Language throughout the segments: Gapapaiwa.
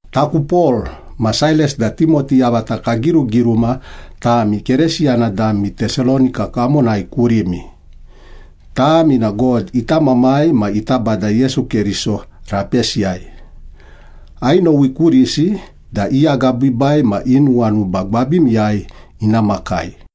Taku Pol, ma Sailas da Timoti yavata kagirugiruma tami Keresiyana dami Tesalonika kamonai kurimi. Tami na God ita Mamai ma ita Bada Yesu Keriso rapesiyai. Ainowi kurisi da i agabiibai ma i nuwanuba gwabimiyai ina makai.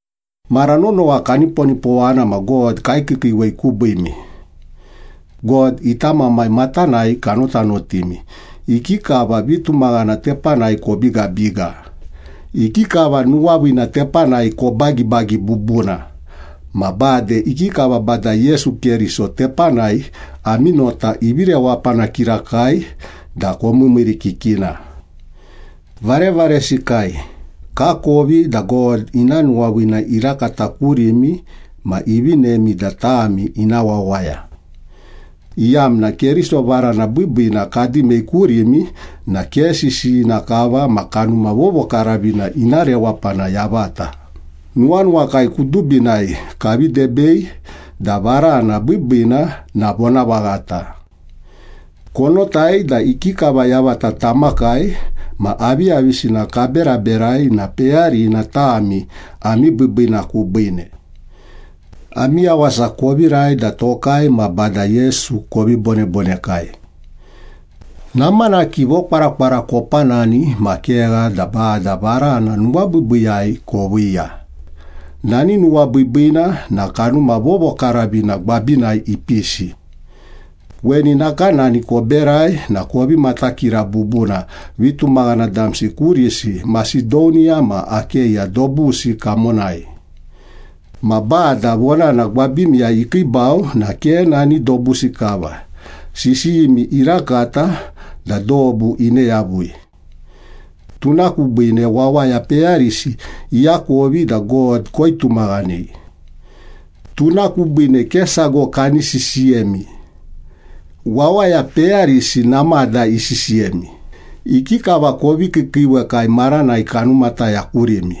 Mara nonowa kaniponipowana ma God kaikiikiiwei kubiimi. God ita Mamai matanai kanotanotimi, ikikava vitumaghana tepanai kobigabiga, ikikava nuwaviina tepanai kobagibagi bubuna, ma bade ikikava Bada Yesu Keriso tepanai ami nota ivi rewapana kirakai da komiimiirikikina. Varevaresikai, kakovi da God ina nuwaviina irakata kurimi ma ivinemi da tami ina wawaya, iyamna Keriso varana biibiina kadimei kurimi na ke sisiyina kava ma Kanuma Vovokaravina ina rewapana yavata, nuwanuwakai kudubinai kavi debei da varana biibiina na vonavaghata. Konotai da ikikava yavata tamakai ma aviyavisina kaberaberai na peyarina tami ami biibiina kubiine. Ami yawasa kovirai da tokai ma Bada Yesu kovi bonebonekai. Namanaki vokwarakwara kopanani ma kegha da Bada varana nuwabiibiiyai koviiya, nani nuwabiibiina na Kanuma Vovokaravina gwabinai ipisi. Weni nakanani koberai na kovi matakira bubuna vitumaghana damsi kurisi Masedoniya ma Akeya dobusi kamonai. Ma Bada vonana gwabimiyai ikiibau na ke nani dobusi kava, sisiyimi irakata da dobu ine yavui. Tuna kubiine wawaya peyarisi iakovi da God koitumaghanei. Tuna kubiine ke sago kani sisiyemi. Wawaya peyarisi namada isisiyemi, ikikava kovi kiikiiwekai maranai kanumataya kurimi.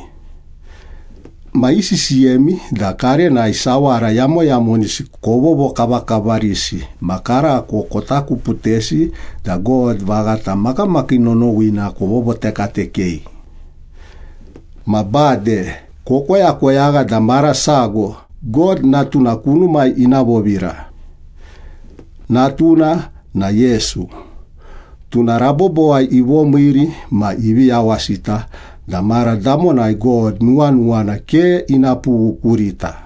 Ma isisiyemi da karenai sawara yamoyamonisi kovovokavakavarisi ma karako kotakuputesi da God vaghata makamakii nonowina kovovotekatekei. Ma bade kokoyakoyagha da mara sago God Natuna kunumai ina vovira. Natuna na Yesu, tuna rabobowai ivomiiri ma ivi yawasita da mara damonai God nuwanuwana ke ina pughu kurita.